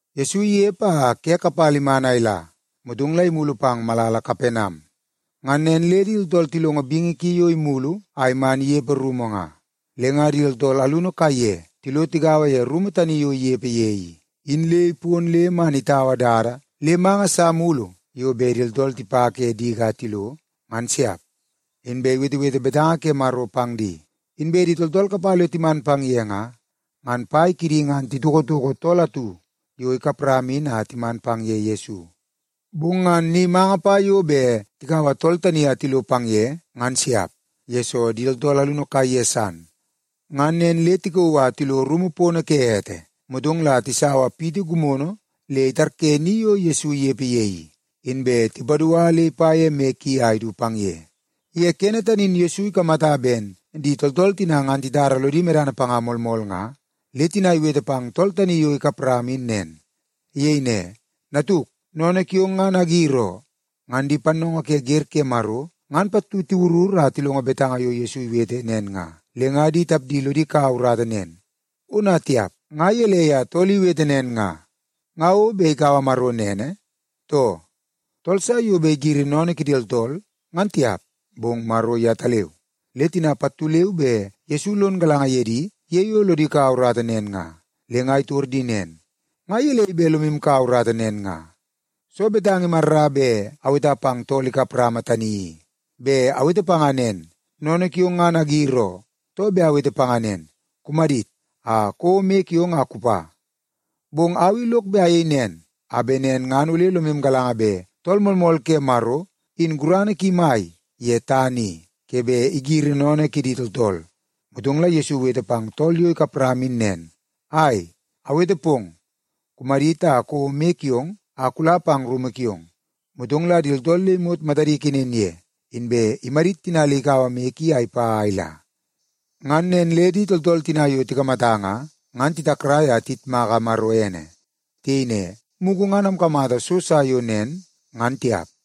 Yesu inepe a ke kapala iman a ila, motong la imulu pang malala Kapenam. Ngan nen le di tooltool tilongo bingi ki yo imulu a man inepe rumu nga. Le nga di tooltool alunu kaiye tilo tigaua ye rumu tani yo inepe ye i, in le ipon le man itaua dada le manga sa mulu yo bet di tooltool tipa ke diki a tilo, ngan siap. Inbe iwetewete betanga ke Maro pang di. Inbe di tooltool kapala yo timan pang ye nga, ngan pai kidi ngan titokotoko tool atu yo ikap rama in a timan pang ye Yesu. Bong ngan ni manga pa yo bet tikaua tool tani a tilo pang ye, ngan siap, yesoo di tooltool alunu kaiye san. Ngan nen le tikauu a tilo rumu pono ke ete, motong la tisaua ni gimono atu le itarye ni yo Yesu inepe ye i, inbe tipadua le ipa ye moi ki a idu pang ye. Ye kene tani in Yesu ikamata ben di tooltool tina ngan titara lodi medana panga moolmool nga, le tina iwete pang tool tani yo ikap rama in nen. Iyei ne, “Natuk, sennene kiong ngan agir oo.” Ngan di pannoongoo ke wer ke Maro ngan pattu tiwurur a tilongo betanga yo Yesu iwete nen nga, le nga di tapdi lodi kaua urata nen, “Ona tiap, nga gelei a tool i iwete nen nga? Nga o bet ikaua Maro nene, too? Tool sa yo bet igiri sennene kidi tooltool ngan tiap, bong Maro yetaleu.” Le tina pattu leu be Yesu lon galanga ye di ye yo lodi kaua urata nen nga, le nga itor di nen, “Nga gelei bet lomu kaua urata nen nga? Soo betanga imarra bet aweta pang tool kap rama tani i? Bet awete panga nen, ‘Sennene kiong ngan agir oo,’ too bet awete panga nen, ‘Kumadit, a kouo moi kiong a kupa’? Bong au i lok bet ayei nen, a bet nen ngan ole lomu galanga bet Tool Moolmool ke Maro in gurana ki mai ye tana i, ke bet igiri sennene kidi tooltool.” Motong la Yesu iwete pang tool yo ikap rama in nen, “Ai, awete pong, kumadit a kouo moi kiong a kula pang rumu kiong.” Motong la di tooltool le imot matadi ikenen ye, inbe imadit tina le ikaua moi ki a ipa a ila. Ngan nen le di tooltool tina yo tikamata nga, ngan titakrai a tiyitmaka Maro ene. Tiyei ne, “Mugu ngan amkamata so sa yo nen, ngan tiap!”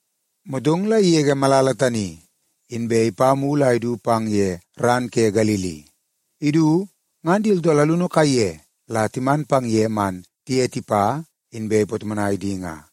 Motong la igege malala tani, inbe ipa mulu a idu pang ye ran ke Galili. Idu, ngan di tooltool alunu kaiye la timan pang ye man tiye tipa, inbe ipatomonai di nga.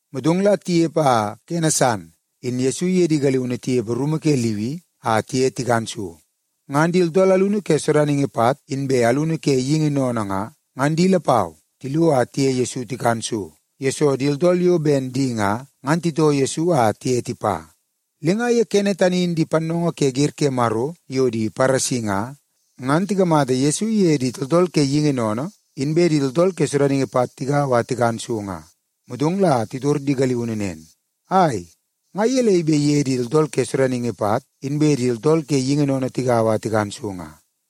Motong la tinepe a kene san in Yesu iye di galiunu tinepe rumu ke Liwi a tiye tikan so. Ngan di tooltool alunu ke sodaningi pat, inbe alunu ke geingi sennene nga, ngan di lapau tilo a tiye Yesu tikan so, yesoo di tooltool yo ben di nga, ngan titoo Yesu a tiye tipa. Le nga ye kene tani in di pannoongoo ke wer ke Maro pattu yo di Paresi nga, ngan tikamata Yesu iye di tooltool ke geingi sennene, inbe di tooltool ke sodaningi pat tigaua a tikan so nga. Motong la titor di galiunu nen, “Ai, nga gelei bet iye di tooltool ke sodaningi pat, inbe di tooltool ke geingi sennene tigaua a tikan so nga?”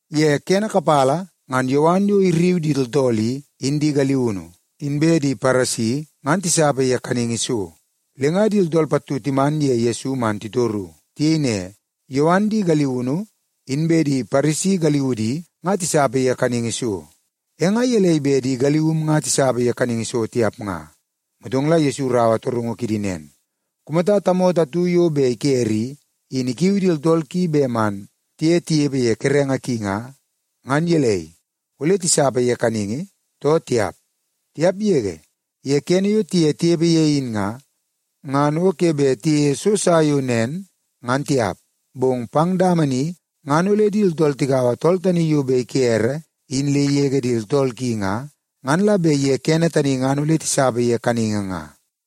Ye kene kapala ngan Yowan yo irriu di tooltool i, in di galiunu, inbe di Paresi ngan tisapa ye kaningi so. Le nga di tooltool pattu timan ye Yesu man titoru. Tiyei ne, “Yowan di galiunu, inbe di Paresi galiudi nga tisapa ye kaningi so, e nga gelei bet di galium nga tisapa ye kaningi so tiap nga?” Motong la Yesu iraua torungu kidi nen, “Kumata tamoto atu yo bet ikere i, in ikiu di tooltool ki bet man tiye tinepe ye kerenge ki nga, ngan gelei, ole tisapa ye kaningi, too tiap? Tiap yege! Ye kene yo tiye tinepe ye in nga, ngan o ke bet tiyeie so sa yo nen, ngan tiap. Bong pang dama ni ngan ole di tooltool tikaua tool tani yo bet ikere in le igege di tooltool ki nga, ngan la bet ye kene tani ngan ole tisapa ye kaningi nga.”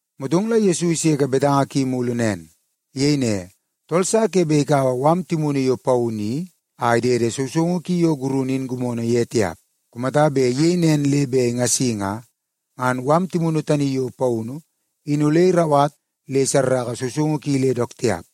Motong la Yesu iseke betanga ki mulu nen. Iyei ne, “Tool sa ke bet ikaua mala timunu yo paunu i a idede sousoungu ki yo gurunu in gimono ye tiap. Kumata bet iyei nen le bet ingasi nga, ngan mala timunu tani yo paunu i, in ole irauwat le isarraka sousoungu ki le dook tiap.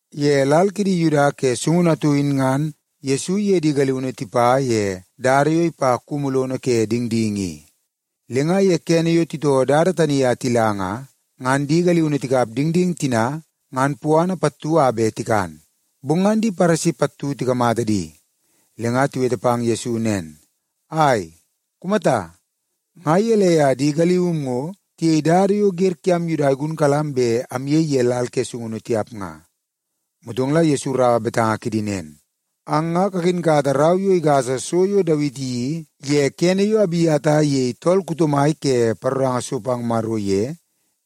Ye lal kidi Yuda ke sungunu atu in ngan Yesu iye di galiunu tipa ye dada yo ipa kumu lono ke dingding i. Le nga ye kene yo titoo dada tani a tila nga, ngan di galiunu tikap dingding tina ngan puana pattu a bet tikan. Bong ngan di Paresi pattu tikamata di, le nga tiwete pang Yesu nen, “Ai, kumata! Nga gelei a di galium ngo tiyei dada yo wer kiam Yuda igunkalam bet amyei ye lal ke sungunu tiap nga?” Motong la Yesu iraua betanga kidi nen, “Ang nga kakinkata rau yo igasa so yo Dawiti iyeii ye kene yo Abiata iyei tool kuto mai ke paroranga so pang Maro ye,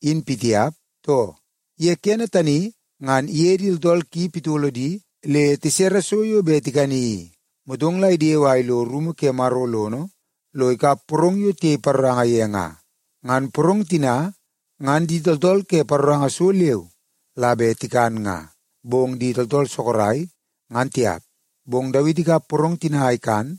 in pitiap, too? Ye kene tani ngan iye di tooltool ki pitolo di le tisere so yo bet tikani i. Motong la idewe a ilo rumu ke Maro lono, lo ikap porong yo tiyei paroranga ye nga. Ngan porong tina, ngan di tooltool ke paroranga so leu la bet tikan nga, bong di tooltool sorok, ngan tiap. Bong Dawiti ikap porong tina a ikan,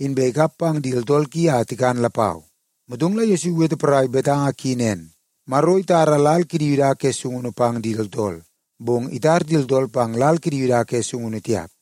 inbe ikap pang di tooltool ki a tikan lapau.” Motong la Yesu iwete porai betanga ki nen, “Maro itara lal kidi Yuda ke sungunu pang di tooltool, bong itar di tooltool pang lal kidi Yuda ke sungunu tiap.